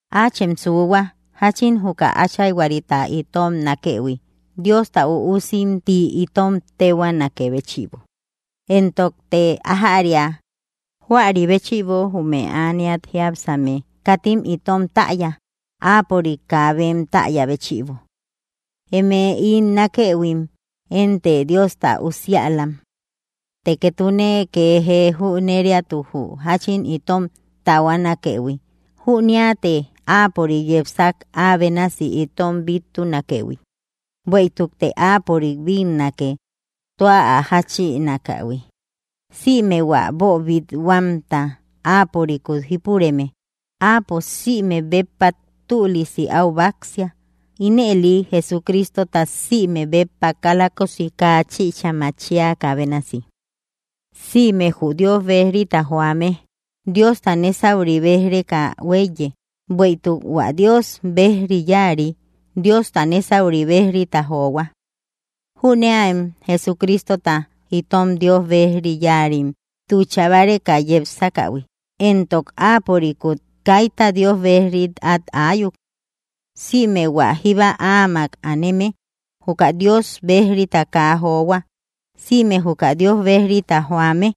Áachem suuhua, jáchin juka Áchayhuarita itom nákëhui, Diosta üusim ti itom téhuaanakë béchïbo, entokte ajäria. Juari béchïbo jume ániat jiápsame katim itom täya, áapörik kaa bem täya béchïbo. Eme ín nákëhuim, énte Diosta usiälam. Të ketune ke jee jüneriatu jü jáchin itom taahuanakëhui, jüniate Áapörik yepsak ä bénasi itom bittunakëhui, bueïtukte áapörik bínnake tua ä jáchinakähui. Sïme hua boobit-huamta Áapörikut jípureme, áapo sïmek béppa tülisi au báksia, Ínëli Jesucristota sïmek béppa kalakosi kaa chïcha machiakä bénasi. Sïme jü Dios bejrita joame, Diosta nésauri béj‑reka hueíye, bueïtuk hua Dios bejri yáari Diosta nésauri béj‑rita johua. Jüneäem Jesucristota itom Dios bejri yáarim tucha báreka yepsakähui, éntok áapörikut kaita Dios bejrim at ayuk. Sïme hua jíba áamak áaneme, juka Dios bejrita kaa johua. Sïme juka Dios bejrita joame,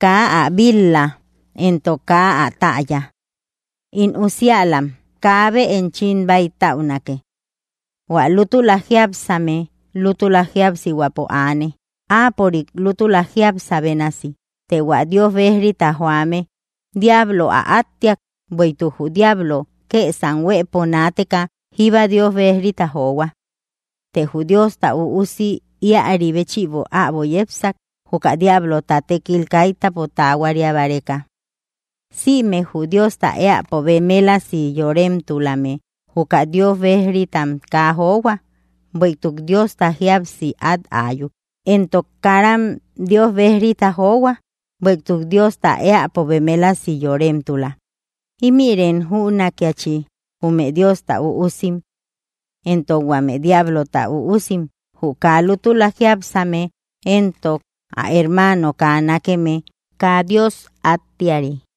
kaa ä bil‑la, éntok kaa ä täya. In usiälam, kaabe enchim bäitäunake. Huä lútula jiápsame, lútula jíapsihuäpo aane, Áapörik lútula jiápsa bénasi. Të hua Dios bejrita joame diablo ä áttiak, bueïtuk jü diablo kësam huëpo naateka jíba Dios bejrita johua. Të jü Diosta Üusi ïari béchïbo äbo yepsak, juka diablota, tékil kaitäpo tahuaria báreka. Sïme jü Diosta éäpo bemelasi yoremtulame juka Dios bejritam kaa johua, bueïtuk Diosta jíapsi at áyuk. Entok karam Dios bejrita johua, bueïtuk Diosta éäpo bemelasi yoremtula. Ímïrim jünakiachi jume Diosta üusim éntok huame diablota üusim: Jü kaa lútula jiápsame éntok ä hermaano kaa nákeme, kaa Dios áttiari.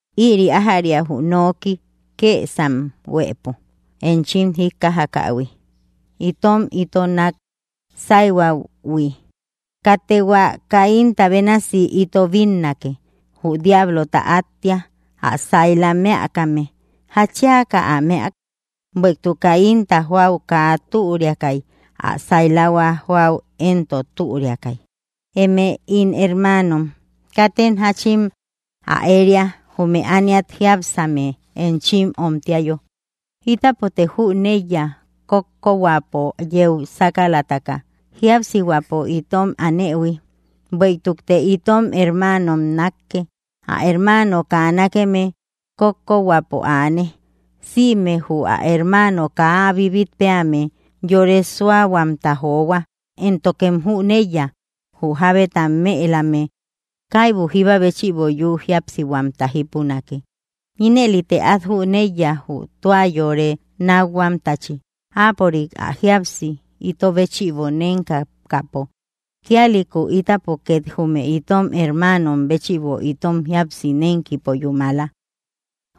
Ïri ájäria jü nooki kësam huëpo enchim jíkkajakähui: Itom ito nak sáihuähui. Katte hua Caínta bénasi ito bínnake, jü diablota áttia, ä saila mëakame. ¿Jatchiaka ä mëak? Bueïtuk Caínta, joäu kaa türiakay, ä sailahua joäu éntok, türiakay. Eme ín hermaanom, katem jáchin ä éria, jume ániat jiápsame enchim omtiayo. Ítapote jüneiya kókkohuäpo yeu sakalataka jíapsihuäpo itom aanëhui. Bueïtukte itom hermaanom nákke, ä hermaano kaa nákeme, kókkohuäpo aane. Sïme jü ä hermaano kaa ä bibit peame, yore suáhuamta johua. Éntokem jüneiya, jü jábeta mëelame käibu jíba béchïbo yü jíapsihuamta jipunake. Inëlite át jüneiya jü tua yore nákhuamtachi, Áapörik ä jíapsi ito béchïbo nénkakäpo. Kíalïku ítapo két jume itom hermaanom béchïbo itom jíapsi nénkipo yúmala.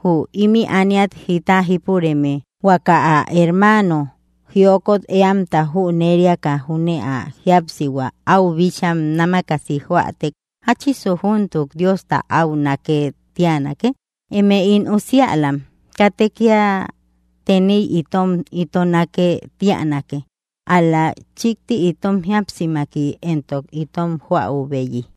Jü imï ániat jita jípureme huaka ä hermaano jiokot éamta jüneriaka júne ä jíapsihua áu bíchaa námakasi joätek, ¿jáchisu júntuk Diosta áu nákë tíanake? Eme ín usiälam, katte kía teniy itom ito nákë tíanake, ál‑la chikti itom jíapsimaki éntok itom joäubeyi.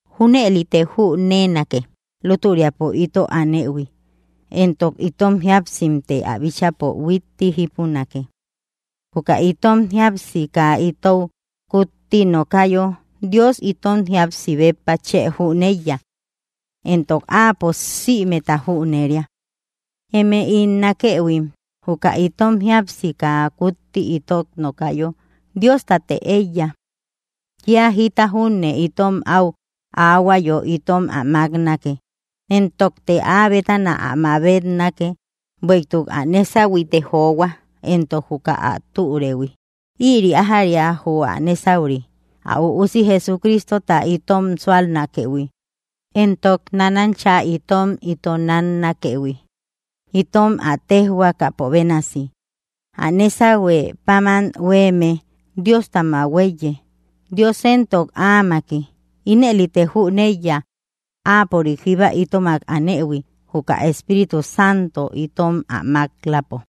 Júnëlite jünenake lútüriapo ito anëhui, éntok itom jíapsimte ä bíchäpo huitti jípunake. Juka itom jíapsi kaa itou kutti nokayo, Dios itom jíapsi béppa chë jüneiya. Entok Áapo sïmeta jüneria. Eme ín nákëhuim, juka itom jíapsi kaa kutti itot nokayo, Diostatte eiya. Kía jita júne itom áu aahuayo itom ä maknake, éntokte ä bétana ä mabetnake, bueïtuk ä nésahuite johua, entok juka ä türëuhui. Ïri ájäria jü ä nésauri: ä Üusi Jesucristota itom súalnakëhui, éntok nánancha itom ito náknakëhui, itom ä téjhuakapo bénasi. Ä nésahue páman huéeme, Diostamak huéiye, Dios éntok, áamaki. Inëlite jüneiya áapörik jíba itomak anëhui, juka ä Espíritu Santo itom ä mak‑lapo.